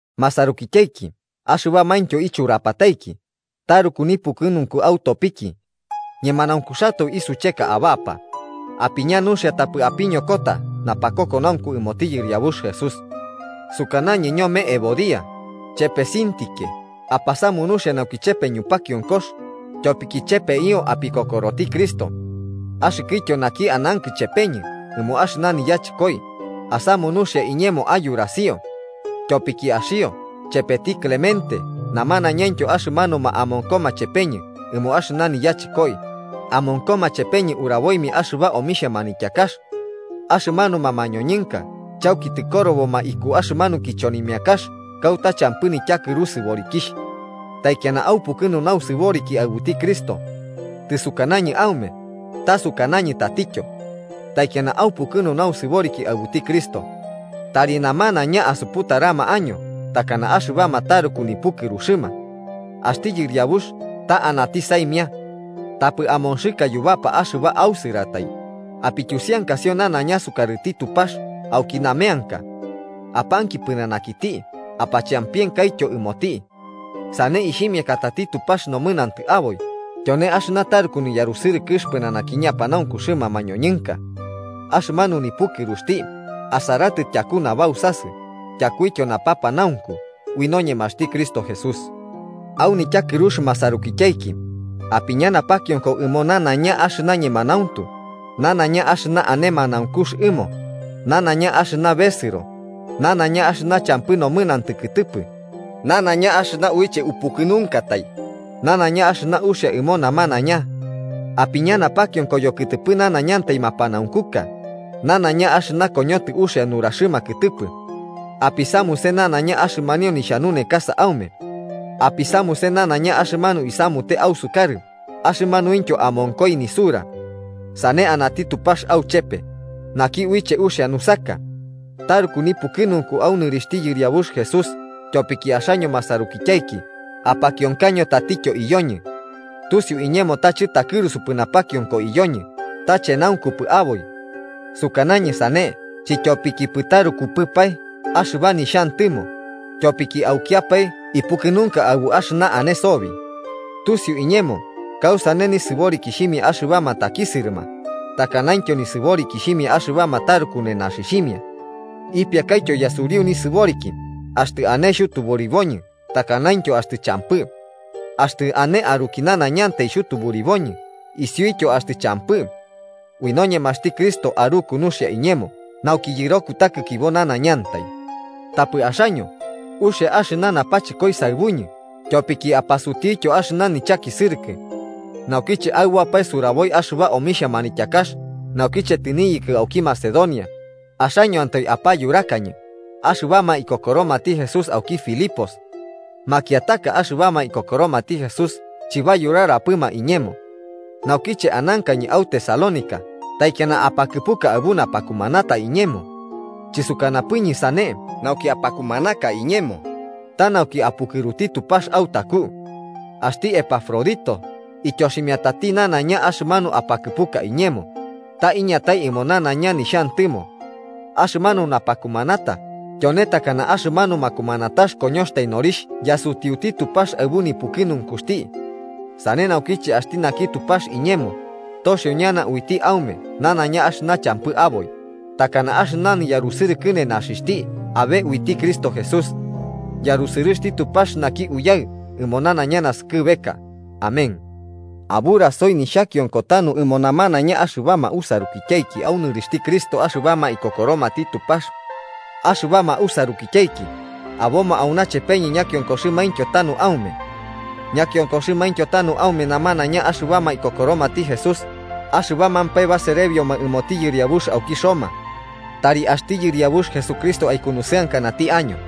Masarukityaiki axɨbamaintyo ichurapataiki, taruku nipukɨnunku autopiki. ¡Ñemanaunkuxatoe isucheka abapa! ¡Apiña nuxia tapɨ apiñokota napakokonaunku ɨmoti Yɨriabux Jesús! Sukanañɨ ñome Evodia, chepe Síntique apasamu nuxia nauki chepe ñupakionkox, tyopiki chepeio opikokoroti Cristo. Axɨkɨtyo naki anankɨ chepeñɨ ɨmo axɨna niyachɨkoi, asamu nuxia iñemo ayurasio. Tyopiki axio, chepeti Clemente namanaiñaintyo axɨmanuma amonkoma chepeñɨ ɨmo axɨna niyachɨkoi, amonkoma chepeñɨ uraboimia axɨba omixhia manityakax. Axɨmanuma mañoñɨnka chauki tɨkoroboma iku axɨmanu kichonimiakax kauta champɨ nityakɨru sɨborikixh. ¡Taikiana aupukɨnu nausɨboriki aɨbuti Cristo! Tɨsukanañɨ aume, ta sukanañɨ tatityo: ¡Taikiana aupukɨnu nausɨboriki aɨbuti Cristo! Tari namanaiña asuputarama año takana axɨbama taruku nipukɨruxɨma. Axti Yɨriabux ta anati saimia. Tapɨ amonxɨka yubapa axɨba ausɨratai, apityusiankasio nanaiña sukarɨti Tupax auki nameanka. Apanki pɨnanakiti apachampienkaityo ɨmoti. Sane ixhimiakatati Tupax nomɨnantɨ aboi, tyone axɨna taruku niyarusɨrɨkɨx pɨnanaki ñapanaunkuxɨma mañoñɨnka. Axɨmanu nipukɨruxti asaratɨ tyaku nabausasɨ tyakuityo napapanaunku ui noñemaxti Cristo Jesús. Au nityakɨrux masarukityaiki, apiña napakionko ɨmo nanaiña axɨna ñemanauntu, nanaiña axɨna ane manaunkux ɨmo, nanaiña axɨna besɨro, nanaiña axɨna champɨ nomɨnantɨ kɨtɨpɨ, nanaiña axɨna uiche upukɨnunkatai, nanaiña axɨna uxia ɨmo namanaiña. Apiña napakionko yokɨtɨpɨ nanaiñantai mapanaunkuka, nanaiña axɨna koñotɨ uxia nuraxɨma kɨtɨpɨ. Apisamuse nanaiña axɨmanio nixhanunekasa aume. Apisamuse nanaiña axɨmanu isamute ausukarɨ axɨmanuintyo amonkoi nisura. Sane anati Tupax auchepe, naki uiche uxia nusaka. Taruku nipukɨnunku au nɨrixhti Yɨriabux Jesús tyopiki axaño masarukityaiki apakionkaño tatityo iyoñɨ. Tusiu iñemo ta chɨtakɨrusuikipɨ napakionko iyoñɨ, ta chenaunkupɨ aboi. Sukanañɨ sane chityopikipɨ tarukupɨpae axɨba nixhantɨmo, tyopiki aukiapae ipukɨnunka aɨbu axɨna ane sobi. Tusiu iñemo kausane nisɨborikixhimia axɨbama takisɨrɨma, takanaintyo nisɨborikixhimia axɨbama taruku nenaxixhimia. Ipiakaityo yasuriu nisɨboriki axtɨ ane xhutuburiuñɨ takanaintyo axtɨ champɨ. Axtɨ ane aruki nanaiñantai xhutuburiboñɨ isiuityo axtɨ champɨ. Ui noñemaxti Cristo aruku nuxia iñemo nauki yɨro kutakikibo nanaiñantai. Tapɨ axaño, uxia axɨna napachɨkoi saɨbuñɨ tyopiki apasutiutyo axɨna nichakisɨrɨkɨ. Naukiche aɨboapae suraboi axɨba omixhia manityakax naukiche tɨniyɨkɨ auki Macedonia, axañoantai apayurakañɨ, axɨbama ikokoromati Jesús auki Filipos. Makiataka axɨbama ikokoromati Jesús chɨbayurarapɨma iñemo. Naukiche anankañɨ au Tesalónica taikiana apakɨpuka aɨbu napakumanata iñemo. Chɨsukanapɨñɨ sane nauki apakumanaka iñemo, ta nauki apukɨruti Tupax autaku. Axti Epafrodito ityoximiatati nanaiña axɨmanu apakɨpuka iñemo, ta iñatai ɨmo nanaiña nixhantɨmo. Axɨmanu napakumanata tyone takana axɨmanu makumanatax koñoxtai norixh yasutiuti Tupax aɨbu nipukɨnunkuxti. Sane naukiche axti naki Tupax iñemo, toxio ñana uiti aume nanaiña axɨna champɨ aboi, takana axɨna niyarusɨrɨkɨ nenaxixhti abe uiti Cristo Jesús. ¡Yarusɨrɨxti Tupax naki Uyaɨ ɨmo nanaiña naskɨbeka! Amén. Aburasoi nixhakionko tanu ɨmo namanaiña axɨbama usarukityaiki au nɨrixhti Cristo axɨbama ikokoromati Tupax. Axɨbama usarukityaiki aboma auna chepeñɨ ñakionkoxɨmaintyo tanu aume. Ñakionkoxɨmaintyo tanu aume namanaiña axɨbama ikokoromati Jesús, axɨbamampae baserebioma ɨmoti yɨriabux auki Roma. Tari axti Yɨriabux Jesucristo aukunusɨankanati año.